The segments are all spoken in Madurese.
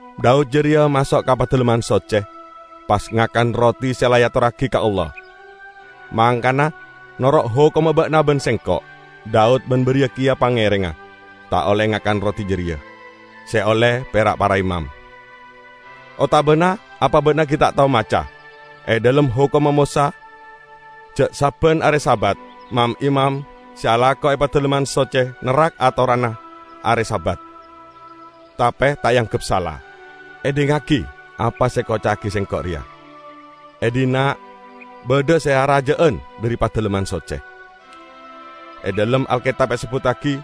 Daud jareya maso' ka Padalemman Socce; pas ngakan roti se la eatorragi ka Allah. Mangkana, noro' hokomma ba'na ban sengko', Daud ban bariya keya pangerengnga, ta' olle ngakan roti jareya -- se olle pera' para imam. Otabana apa ba'na gi' ta' tao maca e dhalem hokomma Mosa ja' sabban are Sabat mam-imam se alako e Padalemman Socce nerrak atoranna are Sabat, tape ta' eanggep sala? Edhingngagi apa se ekoca'agiya Sengko' reya: e dhinna' badha se araja'an dhari Padalemman Socce. E dhalem Alketab esebbuttagi: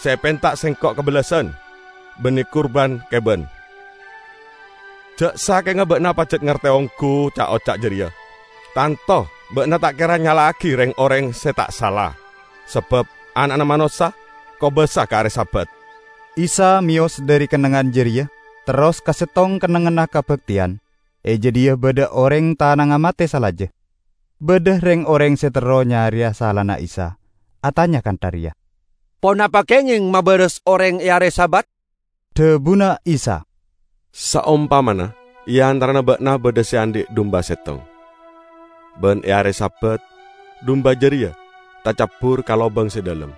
Se epenta Sengko' kabellasan, banne kurban keban. Ja' sakenga ba'na pajat ngarte onggu ca'-oca' jareya, tanto ba'na ta' kera nyala'agi reng-oreng se ta' sala. Sabab Ana'na Manossa kobasa ka are Sabat." Isa meyos dhari kennengngan jareya, terros ka settong kennengnganna kabakteyan. E jadhiya badha oreng se tanangnga mate salaja. Badha reng-oreng se terro nyareya salana Isa, atanya kantha reya, "Ponapa kengeng mabaras oreng e are Sabat?" Dhabuna Isa, "Saompamana e antarana ba'na badha se andhi' dumba settong, ban e are Sabat dumba jareya tacabbur ka lobang se dhalem;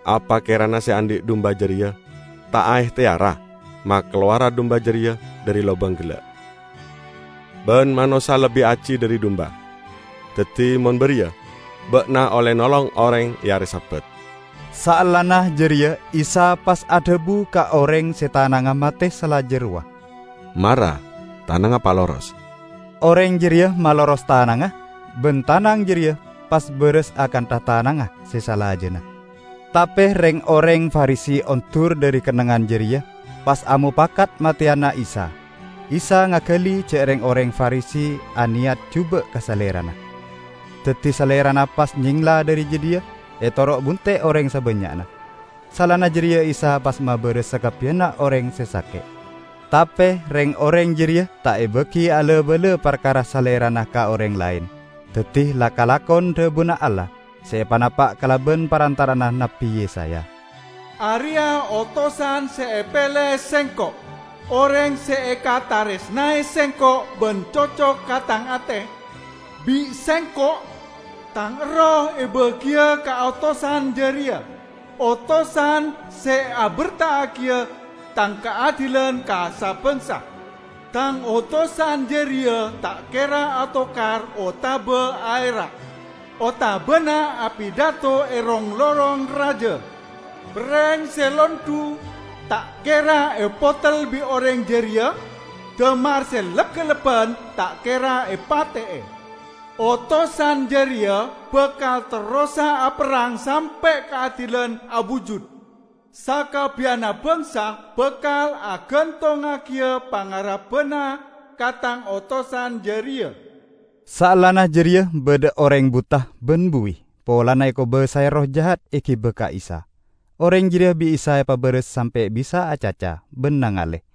apa kerana se andhi' dumba jareya ta' aehteyara makalowara dumba jareya dhari lobang gella'? Ban manossa lebbi aji dhari dumba! Daddi mon bariya, ba'na olle nolong oreng e are Sabat." Saellana jareya Isa pas adhabu ka oreng se tanangnga mate salaja rowa, "Mara tanangnga paloros!" Oreng jareya maloros tanangnga, ban tanang jareya pas baras akantha tanangnga se salajanna. Tape reng-oreng Farisi ondur dhari kennengngan jareya, pas amopakat mateyana Isa. Isa ngagali ja' reng-oreng Farisi aneyat juba' ka Salerana. Daddi Salerana pas nyengla dhari jadhiya etoro' bunte' oreng sabannya'na. Saellana jareya Isa pas mabaras sakabbiyanna oreng se sake'. Tape reng-oreng jareya ta' ebagi ala-bala parkara Salerana ka oreng laen. Daddi la kalakon dhabuna Allah se epanapa' kalaban parantara'anna Nabbi Yesaya, "Areya' otosan se epele Sengko', oreng se ekataresnae Sengko' ban cocok ka Tang ate. Bi' Sengko' Tang Erroh ebagiya ka otosan jareya, otosan se aberta'agiya Tang kaadilan ka sa-bangsa. Tang otosan jareya ta' kera atokar otaba aera', otabana apidato e rong-lorong raja. Perreng se londhu ta' kera epotel bi' oreng jareya damar se lep-kellebban ta' kera epate'e. Otosan jareya bakal terrosa aperrang sampe' kaadilan abujud; sakabbiyanna bangsa bakal agantongngagiya pangarebbanna ka tang otosan jareya." Saellana jareya badha oreng buta ban buwi polana ekobasae erroh jahat egiba ka Isa. Oreng jareya bi' Isa epabaras sampe' bisa acaca ban nangale.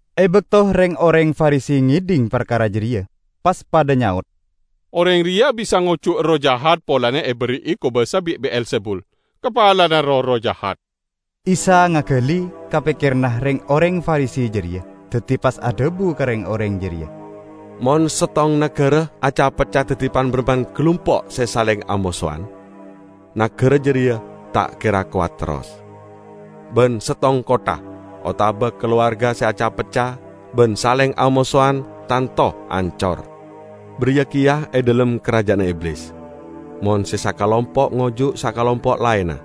E bakto reng-oreng Farisi ngedhing parkara jareya, pas padha nyaot, "Oreng reya bisa ngojuk erroh jahat polana eberri'i kobasa bi' Be'elzebul, kapalana roh-erroh jahat." Isa ngagali ka pekkeranna reng-oreng Farisi jareya, daddi pas adhabu ka reng-oreng jareya, "Mon settong nagara aca-pecca daddi pan-barampan galumpo' se saleng amosowan, nagara jareya ta' kera kowat terros. Ban settong kottha otaba kalowarga se aca-pecca ban saleng amosowan tanto ancor. Bariya keya e dhalem karaja'anna Iblis; mon se sakalompo' ngojuk sakalompo' laenna,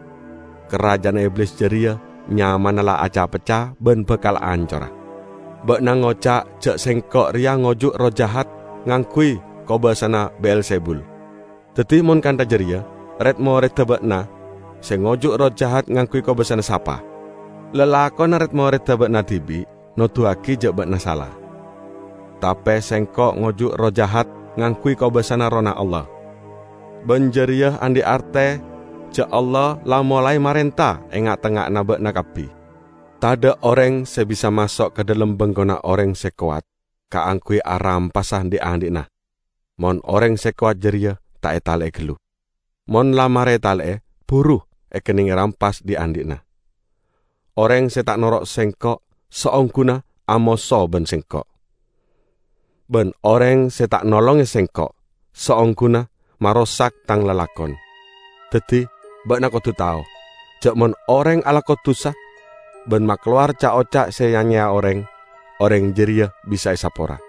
karaja'anna Iblis jareya nyamana la aca-pecca ban bakal ancora. Ba'na ngoca' ja' Sengko' reya ngojuk erroh jahat ngangguy kobasana Be'elzebul. Daddi mon kantha jareya, red-moredda ba'na se ngojuk erroh jahat ngangguy kobasana sapa? Lalakonna red-moredda ba'na dibi' noduwagi ja' ba'na sala! Tape Sengko' ngojuk erroh jahat ngangguy kobasana Errohna Allah. Ban jareya andhi' arte ja' Allah la molae marenta e nga'-tengnga'anna ba'na kabbi. Tadha' oreng se bisa maso' ka dhalem bengkona oreng se kowat kaangguy arampasa dhi'-andhi'na mon oreng se kowat jareya ta' etale'e gallu. Mon la mare etale'e, buru ekenneng rampas dhi'-andhi'na. Oreng se ta' noro' Sengko' saongguna amoso ban Sengko'. Ban oreng se ta' nolonge Sengko' saongguna marosak Tang lalakon! Daddi, ba'na kodu tao, ja' mon oreng alako dusa ban makalowar ca'-oca' se ya-nyeya oreng, oreng jareya bisa esapora!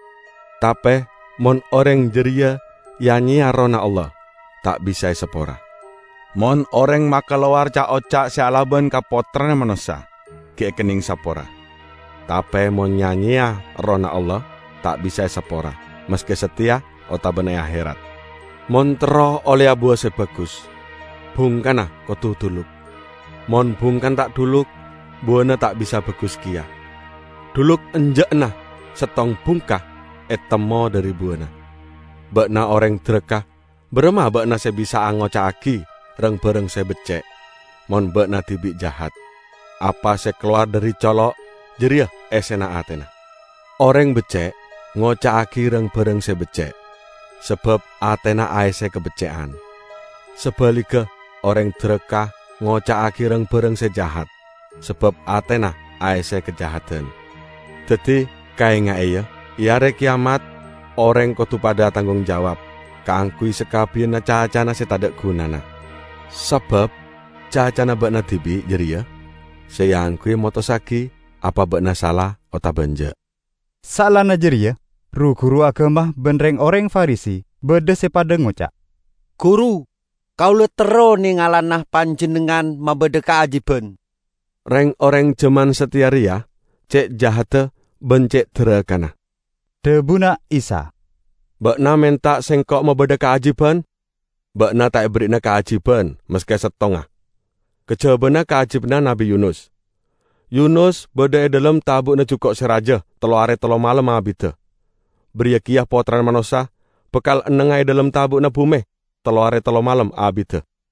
Tape mon oreng jareya ya-nyeya Errohna Allah, ta' bisa esapora! Mon oreng makalowar ca'-oca' se alaban ka Pottrana Manossa, gi' ekenneng sapora; tape mon ya-nyeya Errohna Allah, ta' bisa esapora, maske sateya otabana e aherat!" "Mon terro olleya buwa se bagus, bungkana kodu dhuluk. Mon bungkana ta' dhuluk, buwana ta' bisa bagus keya. Dhuluk enja'na settong bungka etemmo dhari buwana. Ba'na oreng daraka, baramma ba'na se bisa'a ngoca'agi rang-barang se becce' mon ba'na dibi' jahat? Apa se kalowar dhari colo' jareya essena atena! Oreng becce' ngoca'agi rang-barang se becce' sabab atena aesse kabecce'an. Sabaligga, oreng daraka ngoca'agi rang-barang se jahat sabab atena aesse kajahadan. Daddi, kaenga'e, ya: e Are Keyamat, oreng kodu padha atanggung jawab kaangguy sakabbiyanna cacana se tadha' gunana. Sabab cacana ba'na dibi' jareya se eangguya motossagi apa ba'na sala otaba enja'." Saellana jareya ru-guru agama ban reng-oreng Farisi badha se padha ngoca', "Guru, kaula terro nengalana Panjennengngan mabadha kaajiban." "Reng-oreng jaman sateya reya ce' jahadda ban ce' darakana!" dhabuna Isa. "Ba'na menta Sengko' mabadha kaajiban? Ba'na ta' eberri'ana kaajiban maske settonga, kajabana kaajibanna Nabbi Yunus. Yunus badha e dhalem tabu'na juko' se raja tello are tello malem abidda. Bariya keya Pottrana Manossa bakal ennengnga e dhalem tabu'na bume tello are tello malem abidda.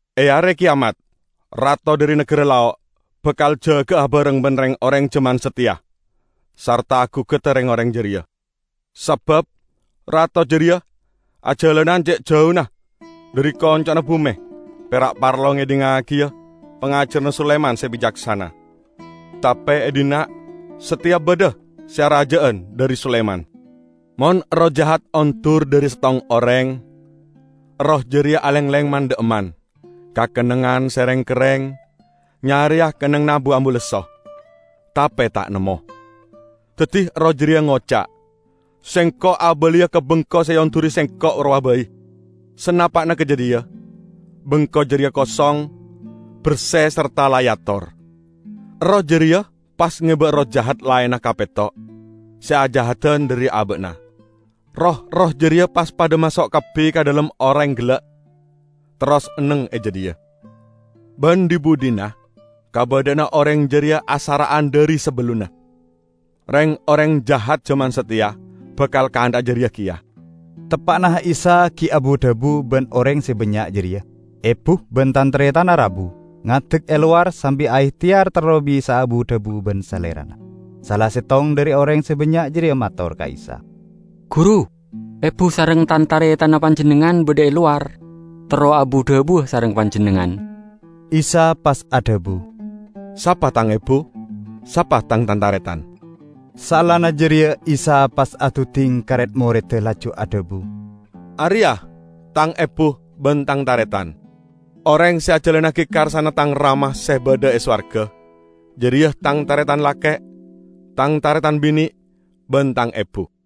E Are Keyamat, rato dhari nagara Lao' bakal jaga'a abareng ban reng-oreng jaman sateya sarta agugada reng-oreng jareya. Sabab rato jareya ajalanan ce' jauna dhari konco'na bume pera' parlo ngedhingngagiya pangajaranna Sulaiman se bicaksana. Tape e dhinna' sateya badha se araja'an dhari Sulaiman!" "Mon erroh jahat ondur dhari settong oreng, erroh jareya alengleng man-dha'emman ka kennengngan se reng-kerreng nyareya kennengnganna bu-ambu lesso, tape ta' nemmo. Daddi erroh jareya ngoca', 'Sengko' abaliya ka bengko se eonduri sengko' rowa bai.' Sanapa'na ka jadhiya, bengko jareya kosong, berse sarta la eator. Erroh jareya pas ngeba erroh jahat laenna kapetto se ajahadan dhari aba'na; roh-erroh jareya pas padha maso' kabbi ka dhalem oreng gella', terros enneng e jadhiya. Ban dhi-budhina kabadha'anna oreng jareya asara'an dhari sabellunna. Reng-oreng jahat jaman sateya bakal kantha'a jareya keya." Teppa'na Isa gi' abu-dhabu ban oreng se bannya' jareya, ebu ban tan-taretanna rabu, ngadek e lowar sambi aehteyar terro bisa'a abu-dhabu ban Salerana. Sala settong dhari oreng se bannya' jareya mator ka Isa, "Guru, ebu sareng tan-taretanna Panjennengngan badha e lowar, terro abu-dhabuwa sareng Panjennengngan." Isa pas adhabu, "Sapa Tang ebu? Sapa Tang tan-taretan?" Saellana jareya Isa pas aduding ka red-moredda laju adhabu, "Areya' Tang ebu ban Tang taretan. Oreng se ajalannagi karsana Tang Rama se badha e sowarga, jareya Tang taretan lake', Tang taretan bine' ban Tang ebu."